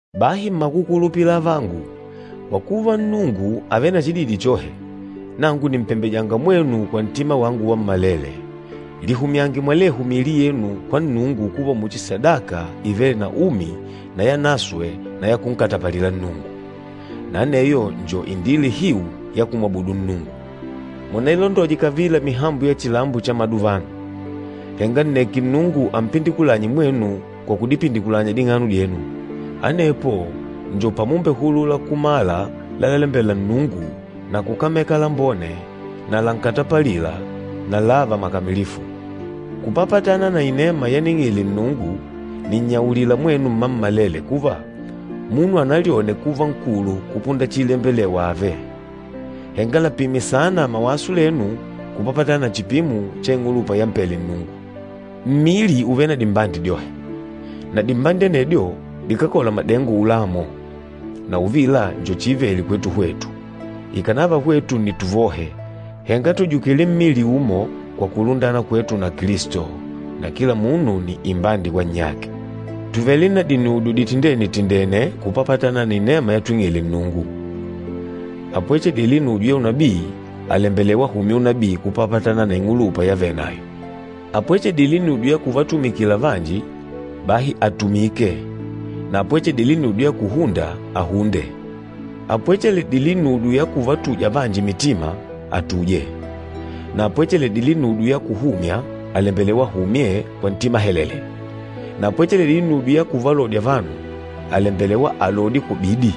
Bahi mmakukulupila avangu, kwa kuva Nnungu àvele na chididi chohe, nangu nìmpembeja mwenu kwa ntima wangu wammalele, lihumyange mwalehu miili yenu kwa Nnungu kuva muchi sadaka ivêle na umi na yanaswe na ya kunkatapalila Nnungu. Na aneyo njo indila ihiu ya kumwabudu Nnungu. Munailondoje kavila mihambo ya chilambo cha maduvano, henga nneke Nnungu ampindikulanye mwenu kwa kudipindikulanya ding'ano dyenu. Anepo njo pamumbehulula kumala lalalembela Nnungu na kukameka lambone na lankatapalila na lààva makamilifu. Kupapatana na inema yaning'ile Nnungu, nìnnyaulila mwenu mmammalele kuva, munu analyone kuva nkulu kupunda chiilembelewa ààve. Henga lapime saana mawaso lenu kupapatana na chipimo cha ing'ulupa yampele Nnungu. Mmili ùvele na dimbandi dyohe, na dimbandi anedyo dikákola madengo ulamo, na uvila njo chiivele kwetu hwetu, ikànava hwetu ni tuvohe, henga tùjukile mmili umo kwa kulundana kwetu na Kilisto, na kila munu nni imbandi kwa nnyake. Tùvele na dinudyo ditindene-tindêne kupapatana na inema yatwing'ile Nnungu. Apwecheledîle inujo ya unabii, àlembelewa ahumye unabii kupapatana na ing'ulupa yavenayo. Apwecheledîle inudyo ya kuvatumikila vanji, bahi atumike. Na apwecheledîle inudyo ya kuhunda, ahunde. Apwecheledîle inudyo ya kuvatuja vanji mitima, atuje, na apwecheledîle inudyo ya kuhumya, àlembelewa ahumye kwa ntima helele, na apwecheledîle inudyo ya kuvalodya vanu, àlembelewa alodye kwa bidi,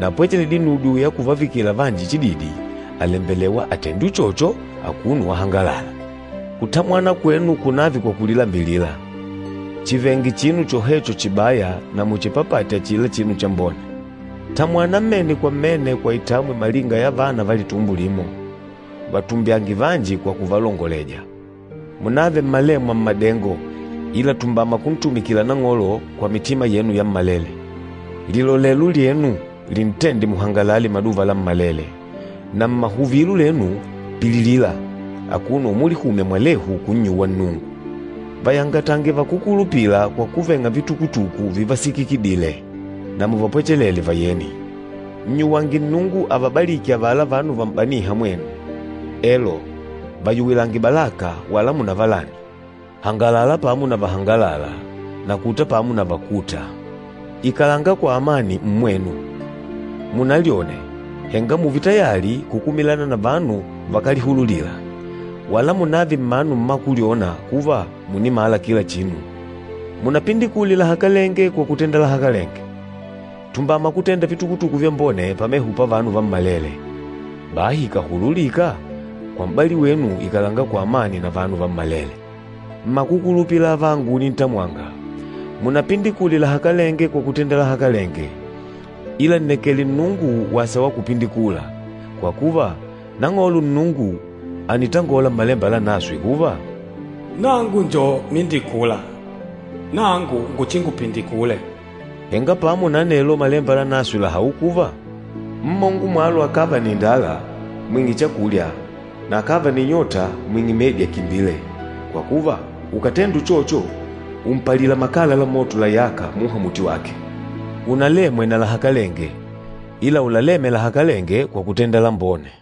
na apwecheledîle inudyo ya kuvavikila vanji chididi, àlembelewa atende uchocho akuno wahangalala. Kutamwana kwenu kunààve kwa kulilambilila. Chivenge chinu chohecho chibaya na muchipapate achila chinu chambone. Tamwana mmene kwa mmene kwa itamwi malinga ya vana va litumbo limo. Vatumbyange vanji kwa kuvalongoleja. Munààve mmalemwa mmadengo, ila tumbama kuntumikila Nang'olo kwa mitima yenu yammalele. Lilolelo lyenu lintende muhangalale maduva lammalele, na mmahuvilo lenu, pililila, akuno umulihumya mwalehu kunnyuwa Nnungu. Vayangatange vakúkulupila kwa kuveng'a vitukutuku vivasikikidile, na muvapwechelele vayeni. Nnyuwange Nnungu avabaliki avala vanu vam'banîha mwenu, elo, vayuwilange balaka wala munavalani. Hangalala pamo na vahangalâla. Na kuta pamo na vakûta. Ikalanga kwa amani mmwenu. Munalyone, henga mùùve tayali kukumilana na vanu vakálihululila. Wala munààve mmanu mmakulyona kuva mùnimala kila chinu. Munapindikule lahakalenge kwa kutenda lahakalenge. Tumbama kutenda vitukutuku vyambone pameho pavanu vammalele. Bahi ikàhululika, kwa m'bali wenu ikalanga kwa amani na vanu vammalele. Mmakukulupila avangu unintamwanga, munapindikule lahakalenge kwa kutenda lahakalenge, ila nnekele Nnungu wasa wa kupindikula, kwa kuva Nang'olo Nnungu ànitangola Mmalemba Lanaswe kuva, “Nangu njo mindikula, nangu nguchingupindikule.” Henga pamo na anelo Malemba Lanaswe làhaula kuva, “Mmongo mwalo akàva na indala, mwing'e chakulya, na akàva na inyota mwing'e medi akimbile. Kwa kuva, ukàtenda uchocho umpalila makala la moto layâka muha muti wake.” Unalemwe na lahakalenge, ila ulaleme lahakalenge kwa kutenda lambone.